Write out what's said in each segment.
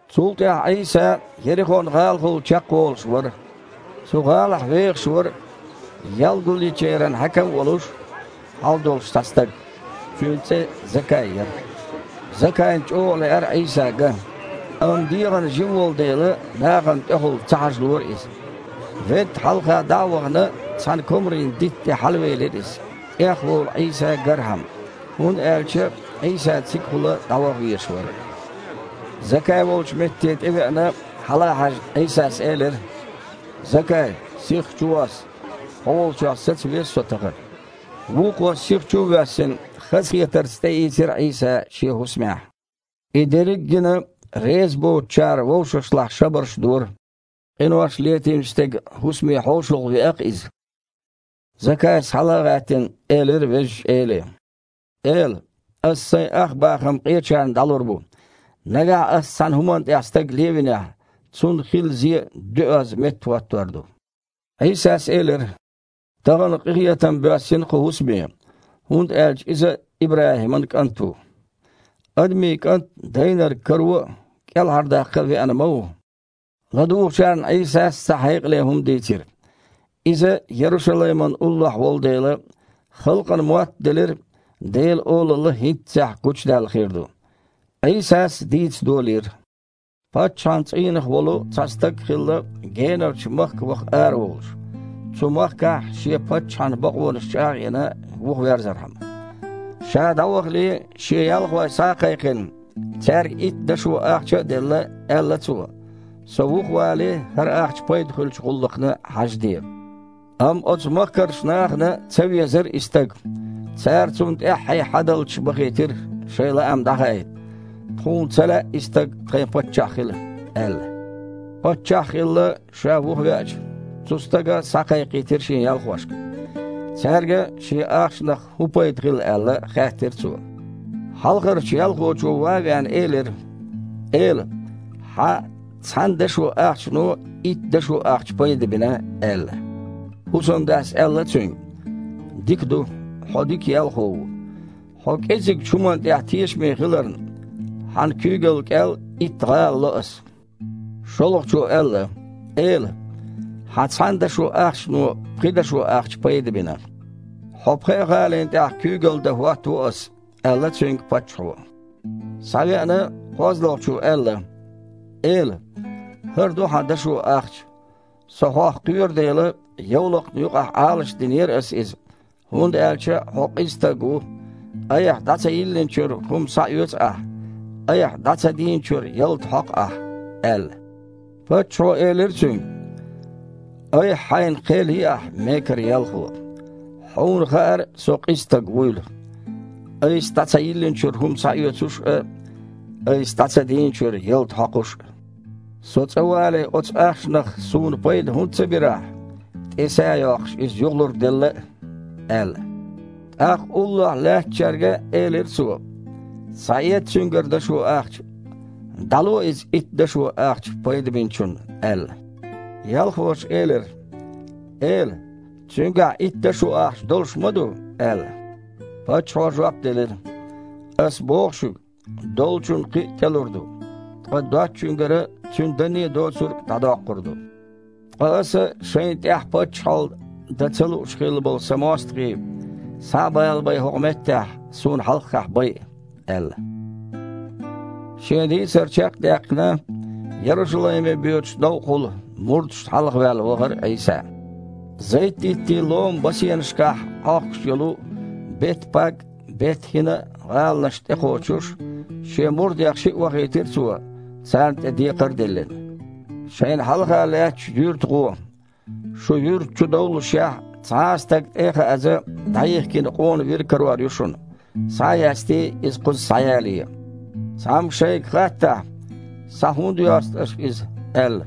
Цул тІаьхьа Іийса Ерихон-гІалахула чекхволуш вара. Цу гІалахь вехаш вара ял гулъечеран хьаькам а волуш, хьал долуш цхьа стаг. Цуьнан цІе Закай яра. Закайна чІогІа лаьара Іийса ган, амма дегІана жима волу дела, нахана тІехула ца хьажалора иза. Ведда хьалха дІа а вахана, цхьана комарийн дитта тІе хьалавелира иза, тІехволу Іийса гархьама, хІунда аьлча Іийса цигахула дІаваха везаш вара. Закай волчу метте тІевеана, хьала а хьаьжна, Іийсас элира: «Закай, сихха чувосса! Хьо волчохь саца веза Со тахана». Вукхо, сиха чу а воьссина, хазахетарца тІеийцира Іийса шен хІусамехь. И дерриг гина, резабоцучара вовшашлахь шабарш дора: «Къинош летийначу стеган хІусаме хьошалгІа веа-кх Иза». Закайс, хьала а гІаьттина, элира Везачу Эле: «Эла! Ас сайн ах бахам къечарна дІалур бу, нагахь ас цхьана хІумана тІехь стаг левинехь, цунна хилла зе доьазза меттахІоттор ду!» Іийсас элира: «Тахана къинхетам боьссина кху хІусаме, хІунда аьлча иза а ИбрахІиман кІант ву. Адамийн КІант дайнарг каро а, кІелхьардаккха а веана ма ву». ЛадугІучарна Іийсас цхьа хьекъале хІума дийцира. Иза Ярушалаймана уллохь волу дела, халкъана моттаделира Делан Олалла хІинццехь гучудаьлла хир ду. Іийсас дийца долийра: «Паччахьан цІийнах волу цхьа стаг хилла генарчу махка ваха араволуш, цу махкахь шен паччахьан бакъонаш чІагІ а йина, вухаверзархьама. Ша дІавахале, шен ялхой схьа а кхайкхина, цаьрга итт дашо ахча а делла, аьлла цо: „Со вухавале, хІара ахча пайда хуьлучу гІуллакхна хьажаде“. Амма оцу махкарчу нахана ца везара и стаг. Цара цунна тІаьххье хьадалчаш бахийтира, шайн лаам дІахаийта: „Тхуна ца лаьа и стаг тхайн паччахь хила“, – аьлла. Паччахь а хилла, ша вухавеача, цу стага схьакхайкхийтира шен ялхошка. Цаьрга, шен ахчанах хІун пайда хилла аьлла, хаьттира цо. Хьалхарчу ялхочо, ван а веана, элира: „Эла! Хьан цхьана дашо ахчано итт дашо ахча пайда бина“, – аьлла. ХІусамдас аьлла цуьнга: „Дика ду, хьо дика ялхо ву. Хьо кІезигчу хІуманна тІехь тешаме хиларна, хьан куьйгалла кІел итт гІала ло ас“. ШолгІачо аьлла: „Эла! Хьан цхьана дашо ахчано пхи дашо ахча пайда бина“. „Хьо пхеа гІалина тІехь куьйгалла дан хІоттаво ас“, – аьлла цуьнга паччахьо. Схьавеана, кхозлагІчо аьлла: „Эла! ХІара ду хьан дашо ахча, со хьох кхоьру дела, йовлакха юкъахь Іалашдинера ас иза, хІунда аьлча хьо къиза стаг ву: айхьа дІа ца йиллинчуьра хІума схьаоьцу ахь, айхьа дІа ца дийначуьра ялта хьокху ахь“, – аьлла. Паччахьо элира цуьнга: „Айхьа-хьайна кхел йи ахь, мекара ялхо! Хьуна хаьара со къиза стаг вуйла: айса дІа ца йиллинчуьра хІума схьаоьцуш а, айса дІа ца дийначуьра ялта хьокхуш а. Со цІа вале оцу ахчанах суна пайда хІунда ца бира ахь, тІе са а йоккхуш иза юхалург делла а?“ – аьлла. ТІаккха уллохь лаьттачаьрга элира цо: „Схьаэца цуьнгара дашо ахча, дІало иза итт дашо ахча пайда бинчунна“, – аьлла. Ялхоша элира: „Эла! Цуьнгахь итт дашо ахча долуш ма ду“, – аьлла. Паччахьо жоп делира: „Ас боху шуьга: долчунна кхин а тІелур ду, ткъа доцучуьнгара цуьнан данне а доцург а дІадоккхур ду. Ткъа аса шайна тІехь паччахьалла дан ца лууш хилла болу сан мостагІий, схьа а балабай, хІокху меттехь, суна хьалхахь байа“, – аьлла». Шен дийцар чекх а даьккхина, Ярушалайме боьдучу новкъахула мурдашна хьалхаваьлла вахара Іийса. Зайт-диттийн ломан басенашкахь Іохкуш йолу Бет-Паг а, Бет-ХІина а гІаланашна тІекхочуш, Шен мурдех шиъ вахийтира Цо, царна тІе декхар а диллина: «Шайна хьалха лаьттачу юьрта дІагІо. Шу юьрта чу довллушехь, цхьа а стаг тІе а хааза, дІайихкина къона вир карор ю шуна, схьа а ястий, иза кхуза схьаялае. Цхьамма шайга хаттахь: „Схьа хІунда йосту аш иза?“ – аьлла,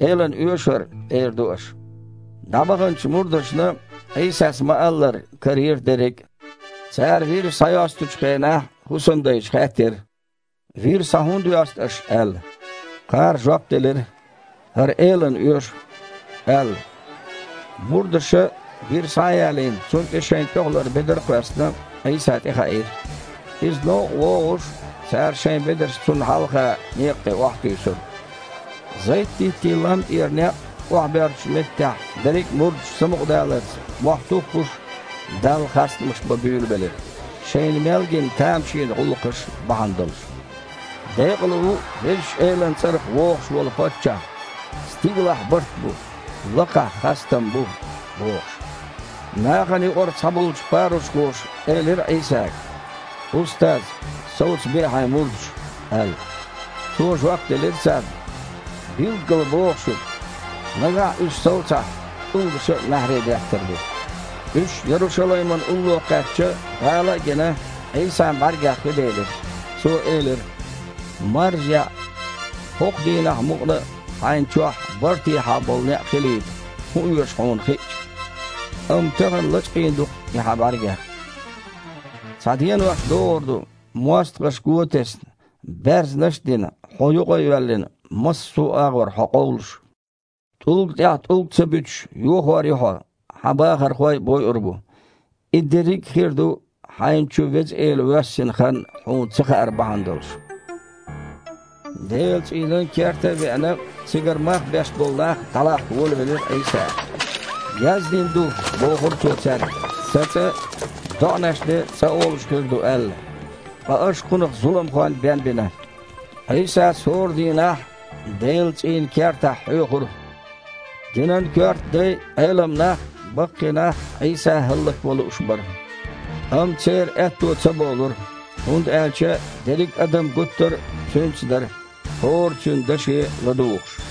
„Элана оьшу хІара“, – эр ду аш». ДІабаханчу мурдашна, Іийсас ма-аллара, карийра дерриг а. Цара вир схьайостучу хенахь, хІусамдайша хаьттира: «Вир схьа хІунда йосту аш?» – аьлла. Кхара жоп делира: «ХІара Элана оьшу», – аьлла. Мурдаша, вир схьа а ялийна, цунна тІе шайн тІехулара бедар а кхоьссина, Іийса тІехаийра. Иза новкъа вогІуш, цара шайн бедарш Цунна хьалха некъа тІе охьатуьйсура. Зайт-диттийн лам тІера некъ охьабоьрзучу меттехь берриг мурдаш самукъадаларца, мохь туххуш Далла хастамаш бан буьйлабелира, шайна мел гина тамашийна гІуллакхаш бахьана долуш: «Декъала ву Везачу Элан цІарах вогІуш волу Паччахь! Стигалахь барт бу, лакхахь хастам бу!» – бохуш. Нахана юкъара цхьаболчу парушхоша элира Іийсага: «Устаз! Совцабе Хьайн мурдаш!» – аьлла. Цо жоп делира царна: «Билггала боху шуьга: нагахь уьш совцахь, тІулгаша а маьхьарий деттар ду». Уьш Ярушалаймана улло кхаьчча, гІала а гина, Іийсан бІаьргех хи делира. Цо элира: «Маржа-яІ! ХІокху дийнахь мукъана а хьайна чохь бартехьа болу некъ хилийта хІун оьшу хьуна хиъча!...Амма тахана лачкъийна ду-кх и хьан бІаьргех. Цхьа денош догІур ду, мостагІаша го а тесна, баьрзнаш а дина, хьо юкъа а йоьллина, массо а агІор хьо къовлуш. ТІулга тІехь тІулг а ца буьтуш, йохор ю хьо, хьан бахархой а бойур бу. И дерриг хир ду, хьайна чу Веза Эла воьссина хан хьуна ца хаар бахьана долуш». Делан цІийнан керта а веана, цигара мах беш болу нах дІалахка волавелира Іийса. «Яздина ду, – бохура Цо цаьрга, – „Сан цІа доІанан цІа хир ду“, – аьлла, ткъа аш кхунах зуламхойн бен бина». Іийсас хІора дийнахь Делан цІийнан кертахь хьоьхура. Динан коьрта дай а, Іелам нах а, баккхий нах а Іийса хІаллакван лууш бара. Амма церан аьтто ца болура, хІунда аьлча дерриг адам гуттар а Цуьнца дара, хІора Цуьнан даше ладугІуш.